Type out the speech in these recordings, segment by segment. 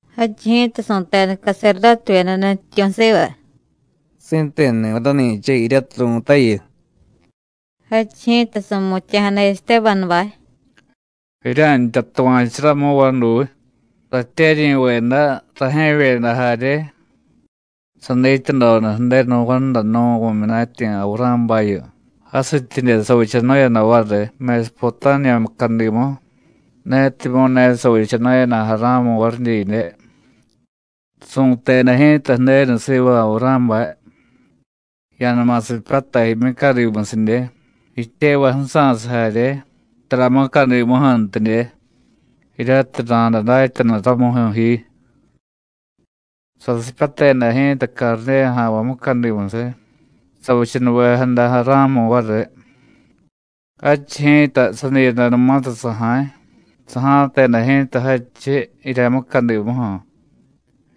Jadchiy ji̱ta su̱teda caserdótevyeda nutyityu̱ siva: “¿Si̱tenuni̱viy rani̱cha jiryatiy ru̱tayu?” Jadchiy ji̱ta su̱mutya̱jada Estébanubay: “Jirya̱ntya tuva̱chu ramu, vaduy, ratyeryi̱veda, rajye̱vyeda jarye. Sadityadoda Ju̱denu Vándanu̱ vu̱myunatyi̱ Avurá̱bayu, jasityidye savichanu̱yada variy Mesupotámiya mucadimu, netimyu̱ ne savichanu̱yada Ará̱mu variy didye. Su̱teda ji̱ta Ju̱denu siva Avurá̱bay: ‘Ya̱numa sipyatay jimyucadimusidye, jityevay ju̱sa̱siy jarye, tara mucadimuju̱ntidye, jiryatiy ra̱day datyanu ramuju̱ ji.’ Sasipyateda ji̱ta Cardéya ja̱nvay mucadimusiy, savichanuvejada Ará̱mu variy. Jadchiy ji̱ta, sadiiyadanumatiy saja̱y, saja̱teda ji̱ta jadchiy jirya mucadimuju̱,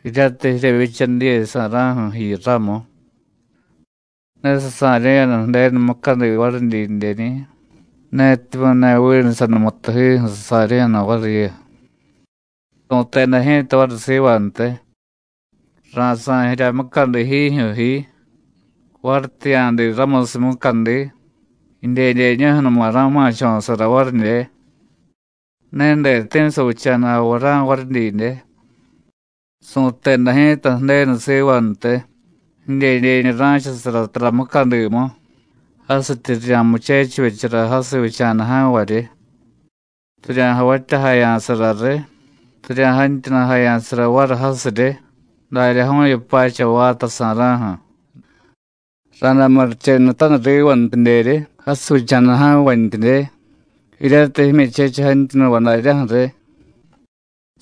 jiryatiy jiryevyicha diye sa̱ra̱ju̱ jiyu ramu. Ne sasa̱ryu̱yada Ju̱denu mucadi varidyidyeñi̱, netimyu̱ ne vinu sanumutujiju̱ sasa̱ryu̱yada variyu. Su̱teda ji̱ta variy sivantiy: Ra̱sa̱y jirya mucadi jiijyu̱ ji, varityi ya̱diiy ramusiy mucadi, jidyedyeñuju̱numa ra̱ma̱cho̱sara varidye. Ne deti̱ savicha̱da Avurá̱ varidyidye. Su̱teda ji̱ta Ju̱denu sivantiy: ‘Jidyedyeñu ra̱chasara tara mucadimu, jasityi rirya̱muchechivyechara jasiy vicha̱da ja̱nvaryi, rirya̱javatyajaya̱sara riy, rirya̱jantyunujaya̱sara variy jasiryi, daryaju̱yu pacha vaata sa̱ra̱ju̱. Ra̱day murichenutaniy rivantidyeryi jasiy vicha̱da ja̱nvantyidye, jiryatiy jimyuchechiy jantyunuvay daryaju̱ riy.’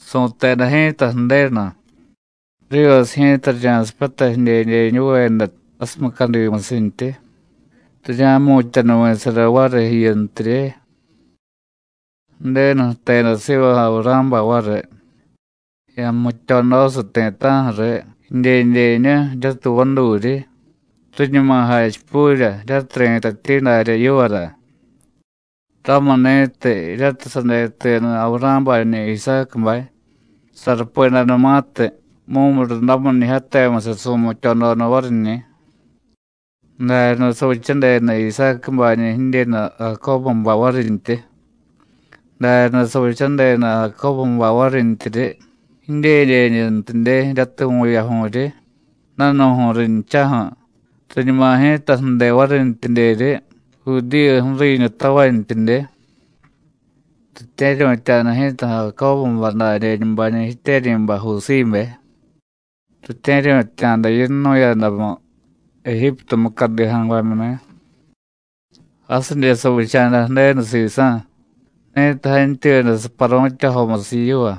Su̱teda ji̱ta Ju̱denu: ‘Rivasiy ji̱ta rirya̱sipyatay jidyedyeñuveda jasiy mucadimusintyi, rirya̱jmu̱tyanuvi̱sara variy jiyuntirye.’ Ju̱denu jteda siva Avurá̱bay variy: ‘Ya̱jmutyodosiy ti̱ta̱ju̱ riy jidyedyeñu jiryatiy vaduryi, riñuma jachipurya jiryatiy ri̱tatyi darya yivara.’ Ramuni̱tiy jiryatiy sadetuyada Avurá̱bañi̱ Isácubay, sarupedanumatiy, mumurundamiñijyatemusiy su̱mutyododa variñi̱. Daryaday savichadeda Isácubañi̱ jidyenu Jacóbubay varintyi; daryaday savichadeda Jacóbubay varintyiryi jidyedyeñuntidye, jiryatiy vu̱yaju̱ryi, danu̱ju̱y rinchaju̱, riñuma ji̱ta ju̱de varintyidyeryi Judíyu ju̱riiñu tavantyidye. Ritye̱ryu̱tya̱da ji̱ta Jacóbubay dadyeñubañi̱ jityeryi̱bay Jusíbe. Ritye̱ryu̱tya̱da yinnu̱yadamu Ejíptu mucadi ja̱nvamyuni̱. Jasidye savicha̱da Ju̱denu sisa̱, ni̱tiy jantyuyada saparu̱tyajomusiy yiva.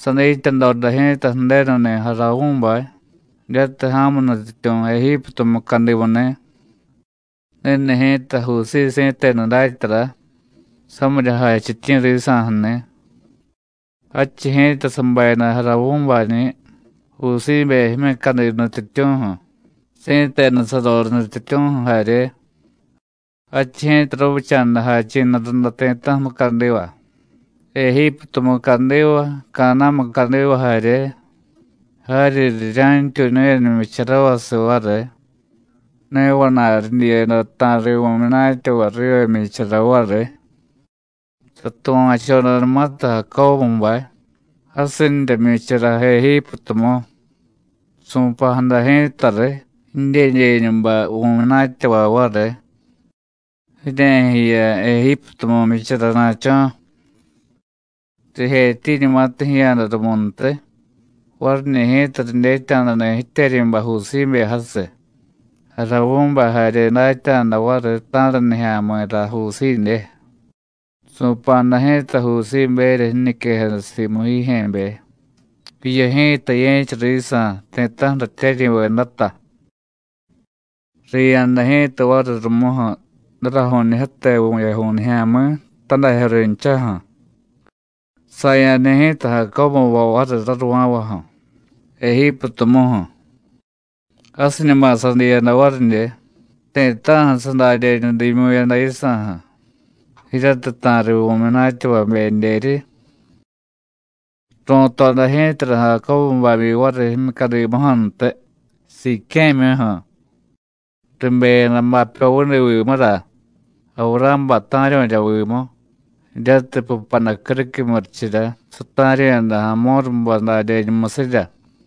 Sadityadoda ji̱ta Ju̱denuni̱ Jaravú̱bay, jiryatiy ja̱mu nutyityu̱ Ejíptu mucadimuni̱: ‘Ni̱ni̱ ji̱ta Jusíy si̱tenu datyara, samirya jachityi̱ risa̱ju̱ni̱.’ Jadchiy ji̱ta sabayada Jaravú̱bañi̱ Jusíbe jimyucadi nutyityu̱ju̱, si̱tenu saroriy nutyityu̱ju̱ jarye. Jadchiy ji̱ta ravicha̱da jachi̱nu runda ti̱ta̱ju̱ mucadiva, Ejíptu mucadiva, Caná̱ mucadiva jarye. Jaryi rirya̱ntyuñu̱yada jmyicharavasiy variy, ne vana̱y ridyiyada ta̱riy vu̱myunatyavay riva jmyichara variy. Satuva̱chodanumatiy Jacóbubay: Jasinrya jmyichara Ejíptumu, su̱pa̱jada ji̱ta riy jidyedyeñubay vu̱myunatyavay variy: ‘Jirye̱jiya Ejíptumu jmyicharana̱cho̱.’ Rijetyiiñumatiy jiya̱da rumuntiy, variñi̱ ji̱ta ridyetya̱dani̱ jityeryi̱bay Jusíbe jasiy, Jaravú̱bay jarye datya̱da variy ta̱ra nijya̱mi̱ra Jusídye. Su̱pa̱jada ji̱ta Jusíberya jiñiquejada simu jijye̱be: ‘Jiyu ji̱ta ye̱cha risa̱, ti̱ta̱ju̱ ratyeryi̱vedata.’ Riya̱da ji̱ta variy rumuju̱ daraju̱ñijyate vu̱yaju̱y nijya̱mi̱, tadajyo rinchaju̱. Saya̱da ji̱ta Jacóbubay variy raruva̱vaju̱, Ejíptumuju̱. Jasiñuma sadiiyada varidye, ti̱ta̱ju̱ sadadyeñu diimyu̱yada yisa̱ju̱, jiryatiy ta̱riy vu̱myunatyavabedyeryi. Ru̱toda ji̱tara Jacóbu babyi variy jimyucadimuju̱ntiy, Siqué̱myuju̱. Ribeyada bapyo vudi vimura, Avurá̱bay ta̱ryu̱rya vimu, jiryatiy pupaday criquiy murichirya sata̱ryu̱yada Amórubay dadyeñumusirya.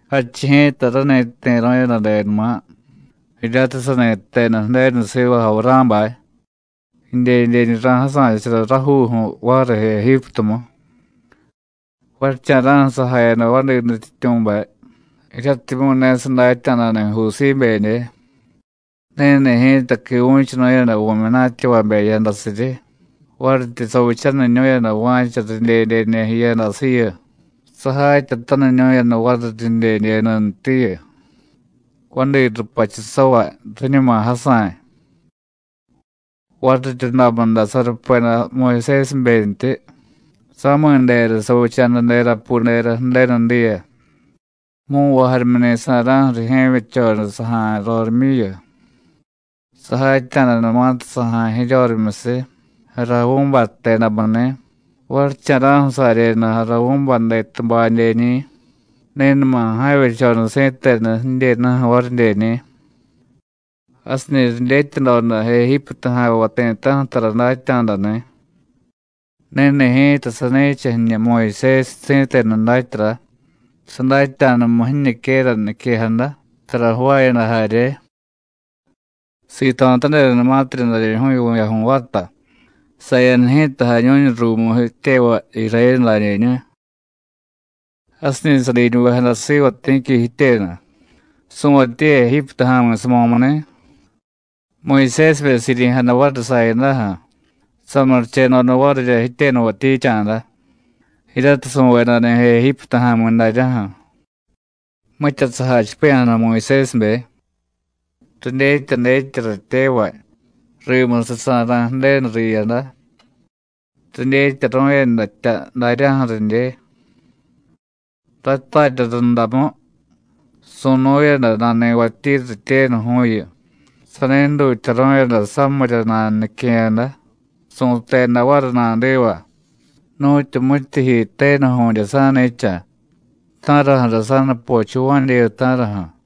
Jadchiy ji̱ta rani jti̱ru̱yadadenuma, jiryatiy sani jteda Ju̱denu siva Avurá̱bay: ‘Jidyedyeñu ra̱jasa̱chara rajuuju̱ variy Ejíptumu.’ Varicha̱ra̱ju̱ sajayada vadi nutyityu̱bay, jiryatimyu̱ ne sadatya̱dani̱ Jusíbedye. Ni̱ni̱ ji̱ta quivu̱chunu̱yada vu̱myunatyavabe jiyadasiryi, varityi savichaniñu̱yada va̱cha ridyedyeñu jiyadasiyu, sajatyataniñu̱yada variy ridyedyeñuntiyu, vadi rupachusavay, riñuma jasa̱y. Variryundamu day sarupeda Muyusésibentyi, sami̱ dera savicha̱da derapudera Ju̱denu diya. Mu̱nvay jarimyuni̱ sa̱ra̱ju̱ rijye̱vyechoda saja̱y rorimyuyu. Sajatya̱danumatiy saja̱y jiryorimyusiy Jaravú̱bay jtedamuni̱, varicha̱ra̱ju̱ saryeda Jaravú̱bay detubadyeñi̱, ni̱numa ja̱vyechoda si̱tenu jidyenuju̱ varidyeni̱. Jasiñi̱ ridyetyadoda Ejíptu ja̱nvay ti̱ta̱ju̱ tara datya̱dani̱. Ni̱ni̱ ji̱ta sani̱cha jiñu Muyusésiy si̱tenu datyara, sadatya̱damu jiñiquera niquejada, tara jvaayada jarye. Sito̱tadedanumatirya daryaju̱yu vu̱yaju̱y vaata, saya̱da ji̱ta jañu̱ñu ruumu jityevay, Irayénu dadyeñu. Jasiñi̱ sadiñuvejada siva ti̱qui jityenu, su̱vatyi Ejíptu ja̱mi̱ samo̱muni̱; Muyusésibe siryi̱jada variy sayadaju̱, samurichedoda varirya jityenu jvatyicha̱da, jiryatiy su̱vedani̱ Ejíptu ja̱mi̱ daryaju̱. Mitya sajachipiya̱jada Muyusésibe: ‘Ridyetya dyetya ratyevay: Rimusiy sa̱ra̱y Ju̱denu riyada,’ ridyetyaru̱yadatya daryaju̱ ridye. Ratarya rundamu, su̱nu̱yada nani̱vatyi rityenuju̱yu, sani jdutyaru̱yada samirya nanunique̱yada, su̱teda variy nadiva: ‘¿Nu̱tyu mityijyi tenuju̱dye sa̱ni̱cha? ¿Ta̱raju̱ra sa̱nupochuvá̱dyeyu, ta̱raju̱?’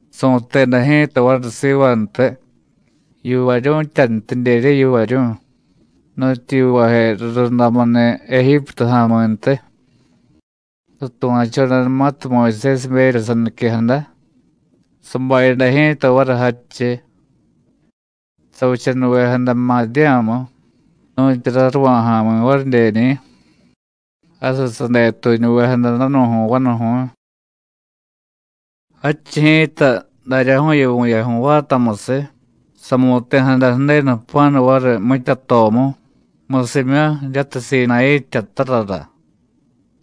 Su̱teda ji̱ta variy sivantiy: ‘¿Yivaryu̱tyantidyerye, yivaryu̱y? nu̱tyu yivaje rurundamuni̱ Ejíptu ja̱mi̱ntiy.’ Satuva̱chodanumatiy Muyusésiberya saniquejada, sabayada ji̱ta variy jadchiy. Savichanuvejada Madiyá̱mu, nu̱tyu raruva̱ ja̱mi̱ varidyeñi̱. Jasiy sadetuñuvejada danu̱ju̱y vanuju̱y. Jadchiy ji̱ta, daryaju̱yu vu̱yaju̱y vaatamusiy, samu̱ti̱jada Ju̱denu jpa̱nu variy mitya tomu, musimyu jiryatiy Sinayí jtyatarara.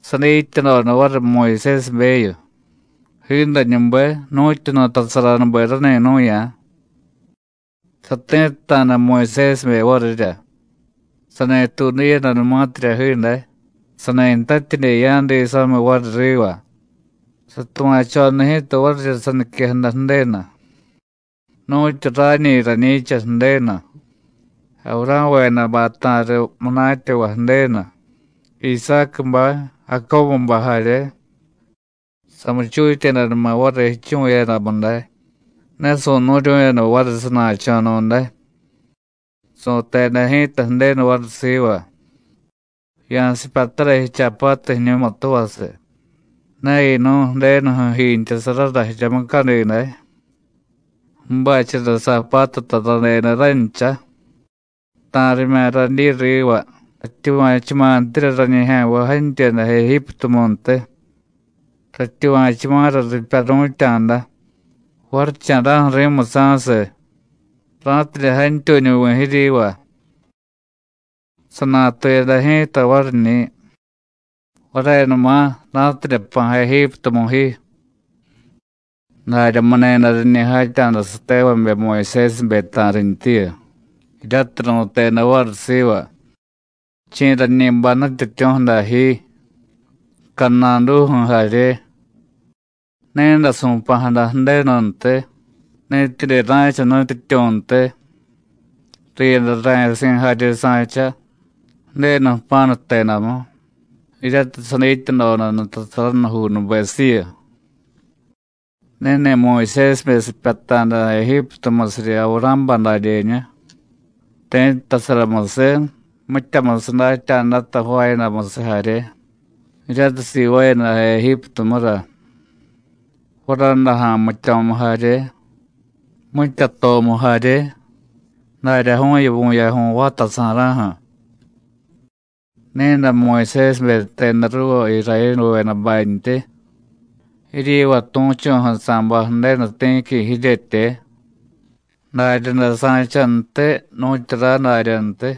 Sadityadoda variy Muyusésibeyu, jiidañube, nu̱tyu nutasaranube rani nu̱ya̱. Sati̱tta̱da Muyusésibe varirya. Sani tuudiyadanumatirya jiiday, sani ntatyidye ya̱diy samiy variy riva, satuva̱choda ji̱ta varirya saniquejada Ju̱denu: ‘Nu̱tyu rañi rañi̱cha Ju̱denu, Avurá̱vedabay ta̱riy munatyavay Ju̱denu, Isácubay, Jacóbubay jarye.’ Samuchutyedanuma variy jichuvu̱yadamu day, ne su̱nu̱ryu̱yada variy sana̱cho̱nu̱day. Su̱teda ji̱ta Ju̱denu variy siva: ‘Ya̱sipyatara jichaapatu jiñumutuvasiy, ne yinu̱y Ju̱denuju̱ jiintyasarara jirya mucadi day, ju̱bachara saapatuta radeda rancha. Ta̱rimya̱ radyi riva, ratyuva̱chuma̱ntirya rañijya̱nvay jantyuyada Ejíptumuntiy. Ratyuva̱chuma̱ra ripyaru̱tya̱da, varicha̱ra̱ju̱ ri̱musa̱siy, ra̱tidye jantyuñuvi̱ jiryiva.’ Sanatuyada ji̱ta variñi̱: ‘Varenuma, ra̱tidye jpa̱ Ejíptumuju̱ ji.’ Daryamuni̱day riñi jatya̱da satevabe Muyusésibe ta̱rintyiyu, jiryatiy ru̱teda variy siva: ‘¿Chi̱ rañi bay nutyityu̱ju̱ dajyi, cadnaduju̱ jarye?’ Ni̱day su̱pa̱jada Ju̱denuntiy, ni̱tidye ra̱cha nutyityu̱ntiy, riyada ra̱yasi̱ jarye sa̱cha, Ju̱denu jpa̱nu jtedamu, jiryatiy sadityadoda nutasaranujuunubesiyu. Ni̱ni̱ Muyusésibe sipyata̱da Ejíptumusiryi Avurá̱bay dadyeñu, ti̱ttasaramusiy, mityamusiy datya̱data jvaayadamusiy jarye, jiryatiy sivaayada Ejíptumura, Varadaja̱ jmityo̱mu jarye, mitya tomu jarye, daryaju̱yu vu̱yaju̱y vaata sa̱ra̱ju̱. Ni̱day Muyusésibe jteda ruuva Irayénuvedabantyi: ‘Jiryiva tu̱chu̱ju̱ sa̱bay Ju̱denu ti̱qui jiryetye. Daryaday sa̱chantiy nu̱tyu ray daryantiy.’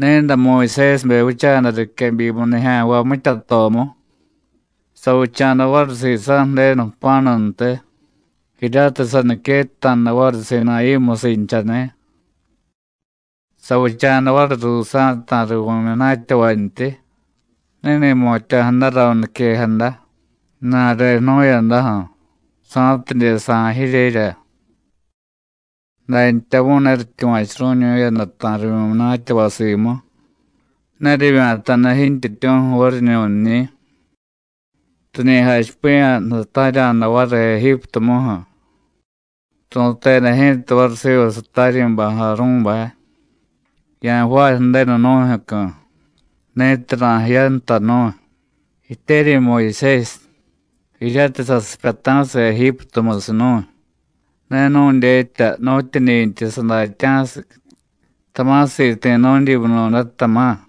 Ni̱day Muyusésibe vicha̱da riquebyimu nijya̱nvay mitya tomu, savicha̱da variy sisa̱ Ju̱denu jpa̱nuntiy, jiryatiy saniquetta̱da variy Sinayí musinchani̱. Savicha̱da variy ruusa̱ ta̱riy vu̱munatyavantyi, ni̱ni̱ jmutya̱jadara niquejada, ju̱na̱re jnu̱yadaju̱, sa̱tidye sa̱y jiryerya. Dantyamu̱y ne rityuva̱churu̱ñu̱yada ta̱riy vu̱myunatyavay simu, ne rivya̱ta̱da jintyityu̱ju̱ variñu̱nñi̱. Riñi jachipiya̱jada ta̱rya̱da variy Ejíptumuju̱. Ru̱teda ji̱ta variy siva sataryi̱bay Arú̱bay: ‘Ya̱jvaay ju̱denu nu̱jyu̱cu̱, ni̱tiy ra̱jiyanta nu̱y. Jityeryi̱ Muyusésiy jiryatiy sasipyata̱siy Ejíptumusiy nu̱y, ne nu̱dyetya nu̱tyuñi̱ntiy sadatyá̱siy, tama̱ siti̱ nu̱dyimunu̱day, tama̱.’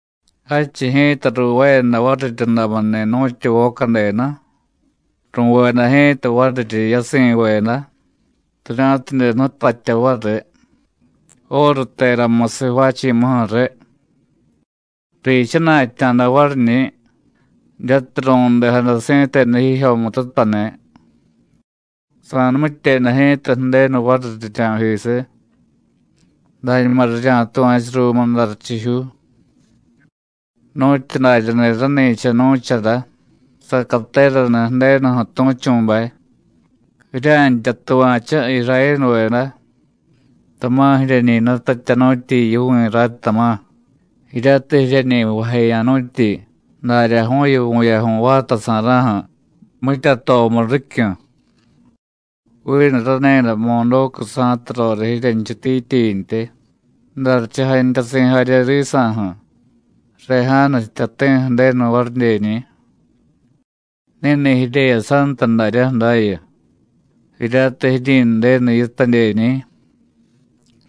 Jadchiy ji̱ta ruuvaayada variryundamuni̱ nu̱tyu voca denu, ru̱veda ji̱ta variryi yasi̱veda, rirya̱tidye jnutatya variy óru teramusiy jvaachi̱muju̱ riy; riichana̱tya̱da variñi̱ jiryatiy ru̱ndejada si̱tenu jijyomututani̱. Sa̱numityeda ji̱ta Ju̱denu variy rirya̱jisiy: ‘Dañuma rirya̱tuva̱chu ruumu jdarichijyuu.’ Nu̱tyu daryani̱ rani̱cha nu̱chara sacateraniy Ju̱denuju̱ tu̱chu̱bay: ‘¿Jirya̱ntya tuva̱chu, Irayénuveda, tama̱ jiryeñi jnutatyanu̱tyi yivi̱ ray, tama̱, jiryatiy jiryeñi jvajeya̱nu̱tyi daryaju̱yu vu̱yaju̱y vaata sa̱ra̱ju̱, mitya tomu ricyu̱? Vinu rani̱day Modócu sa̱tu roriy jiryenchutityintyi, jdarichiy jantyasi̱ jarye risa̱ju̱, Rejánu jtyati̱ ju̱denu varidyeñi̱. Ni̱ni̱ jiryeyasanta daryaju̱ dayu, jiryatiy jiryi̱ndenu yitadyeñi̱.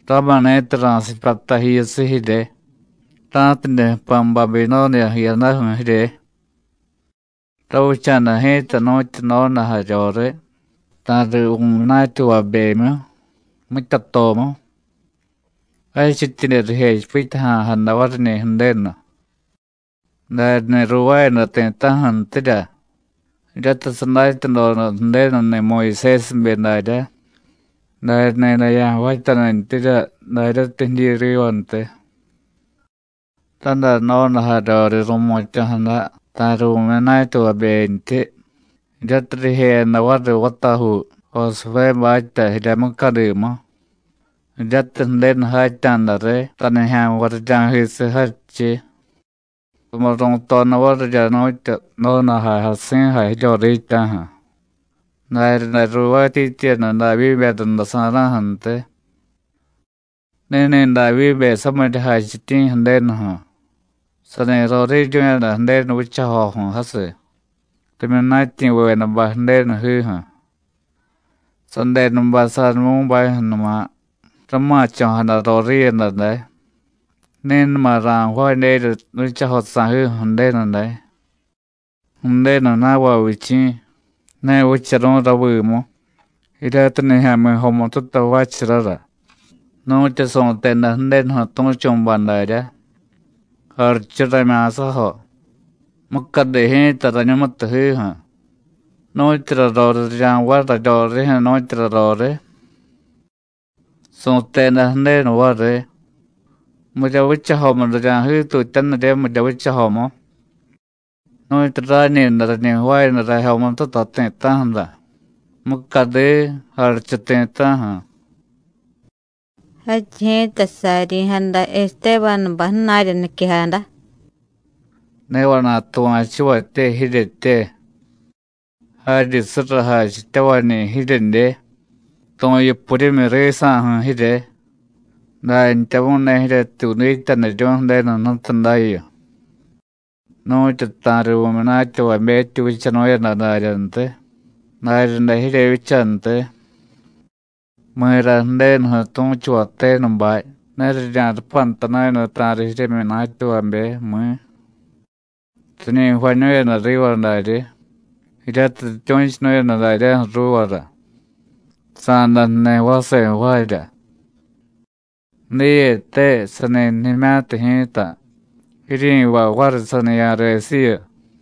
Ramuni̱tiy ra̱sipyata jiyusiy jirye, ra̱tidye jpa̱ Babinóniya jiyadaju̱ jirye.’ Ravicha̱da ji̱ta nu̱tyu donajaryoriy ta̱riy vu̱myunatyavabemyu, mitya tomu, jadchityidye rijechipityaja̱jada variñi̱ Ju̱denu. Daryani̱ ruuvaayada ti̱ta̱ju̱ntirya jiryatiy sadatyadoda Ju̱denuni̱ Muyusésibe daryá: ‘Darya ni̱day ya̱jvaatyanintyirya daryatiy jidyi rivantiy.’ Raday donajaryoriy ru̱mutya̱jada ta̱riy vu̱myunatyavabentyi, jiryatiy rijeyada variy vatajuu Josuvébatya jirya mucadimu, jiryatiy Ju̱denu jatya̱da riy tanijya̱nvay rirya̱jisiy jadchiy. Rumu ru̱toda varirya nu̱tyu donajay jasi̱jay jiryoriitya̱ju̱, daryaday ruuvaatyityiyada Davyíbe rundasa̱ra̱ju̱ntiy. Ni̱ni̱ Davyíbe samirya jachityi̱ Ju̱denuju̱, sani roriiryu̱yada Ju̱denu vichajoju̱ jasiy, rimyunatyi̱vedabay Ju̱denujiju̱. Sadenubay Sadumú̱bajyu̱numa rama̱cho̱jada roriiyada day, ni̱numa ra̱jvaadyerya vichajo sa̱jiju̱ Ju̱denu day. Ju̱denu na̱vay vichi̱, ne vicharu̱y ravimu jiryatiy nijya̱mi̱ jomututa jvaacharara, nu̱tyu su̱teda Ju̱denuju̱ tu̱chu̱bay darya: ‘Jarichu ramya̱sajo, mucadi ji̱ta rañumutujiju̱. ¿Nu̱tyura roriy rirya̱jvaay raryorijyu̱, nu̱tyura roriy?’ Su̱teda Ju̱denu variy: ‘¿Mirya vichajomu rirya̱jiitutyanirye, mirya vichajomu? Nu̱tyu rañi̱day rañi jvaayada rajyomututa ti̱ta̱ju̱ra, mucadi, jarichu ti̱ta̱ju̱.’” Jadchiy ji̱ta sariryi̱jada Estébanubay ju̱na̱rya niquejada: “¡Ne vana̱y tuva̱chuvatye jiryetye! ¡Jaryi surra jachityavañi̱ jiryedye, tu̱yupuryimyi risa̱ju̱ jirye! Dantyamu̱y ne jiryetyuudityaniryu̱y Ju̱denu Jnutu dayu. Nu̱tyu ta̱riy vu̱myunatyavabetyi vichanu̱yada daryantiy, daryaday jiryevyichantiy. ¿Mi̱ra Ju̱denuju̱ tu̱chuvay tenubay ne rirya̱rupantanu̱yada ta̱riy jiryemyunatyavabe, mi̱? Riñi jvañu̱yada riva daryi, jiryatiy rityu̱chunu̱yada daryaju̱ ruuvara: Sa̱day jniy vase jvaarya. Diyete, sani jnimya̱tiy ji̱ta, jiryi̱vay variy saniya̱resiyu.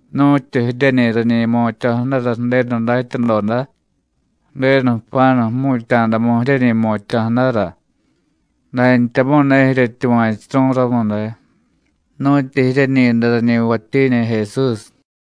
Nu̱tyu jiryeñi rañi jmutya̱jadara Ju̱denu datyadoda, Ju̱denu jpa̱nu jmu̱tya̱damu jiryeñi jmutya̱jadara, dantyamu̱y ne jiryetyuva̱churu̱y ramu day, nu̱tyu jiryeñi̱day rañi jvatyiñi̱ Jesús.”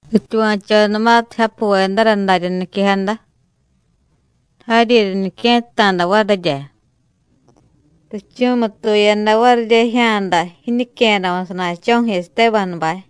Rityuva̱chodanumatiy japuvedara darya niquejada, jaryi riñique̱tta̱da varirya, richu̱mutuyada varirya jijya̱da jiñique̱yadamu sana̱cho̱ju̱ Estébanubay.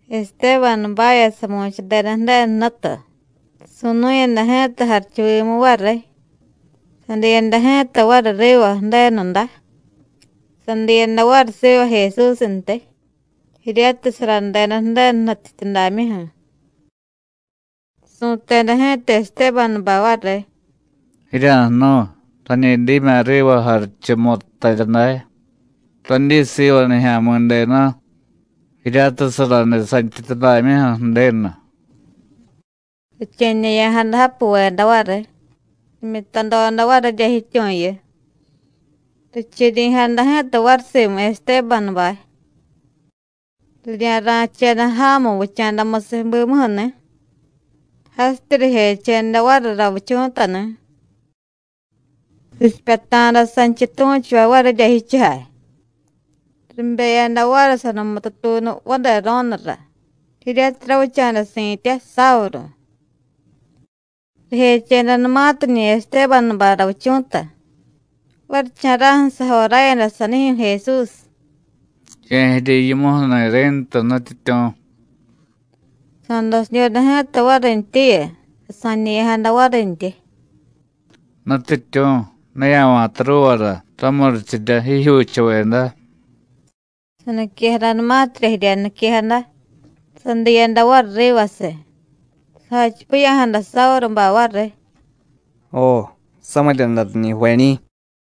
Estébanubavya samu̱chadeda Ju̱denu Jnutu, su̱nu̱yada ji̱ta jarichuvimu variy, sadiyada ji̱ta variy riva Ju̱denudá. Sadiyada variy siva Jesúsntiy, jiryatiy saradeda Ju̱denu nutyityudamyuju̱. Su̱teda ji̱ta Estébanubay variy: “¡Jirya̱jnu̱y! Rañi dimya̱ riva jarichu muttarya day, radyi siva Nijya̱mi̱denu, jiryatiy saraniy santyityudamyuju̱ Ju̱denu.” Riche̱ñe̱ya̱jada japuveda variy, rimyutadoda varirya jityu̱yu, richiryi̱jada ji̱ta variy simu Estébanubay. Rirya̱ra̱cheda ja̱mu vicha̱damusiy bimuju̱ni̱, jasityi rijecheda variy ravichu̱tani̱. Richipyata̱da sanchiy tu̱chuvay varirya jichujay, ribeyada variy sanumutu tuunu vadero̱nura, jiryatiy ravicha̱da si̱tya Sávuru. Rijechedanumatiñi̱ Estébanubay ravichu̱ta, varicha̱ra̱ju̱ sajoráyada sanijyu̱ Jesús: “Ye̱jiriy yimuju̱ni̱ ri̱ntu, Nutyityu̱.” Sa̱dasidyoda ji̱ta varintyiyu, sasa̱ñe̱ya̱jada varintyi: “Nutyityu̱, ne ya̱va̱ta ruuvara ramurichirya jijyuuchuveda.” Saniquejadanumatirya jirya niquejada, sadiiyada variy rivasiy. Sajachipiya̱jada Sávurubay variy: “Jo, samirya day riñi jvañi̱.”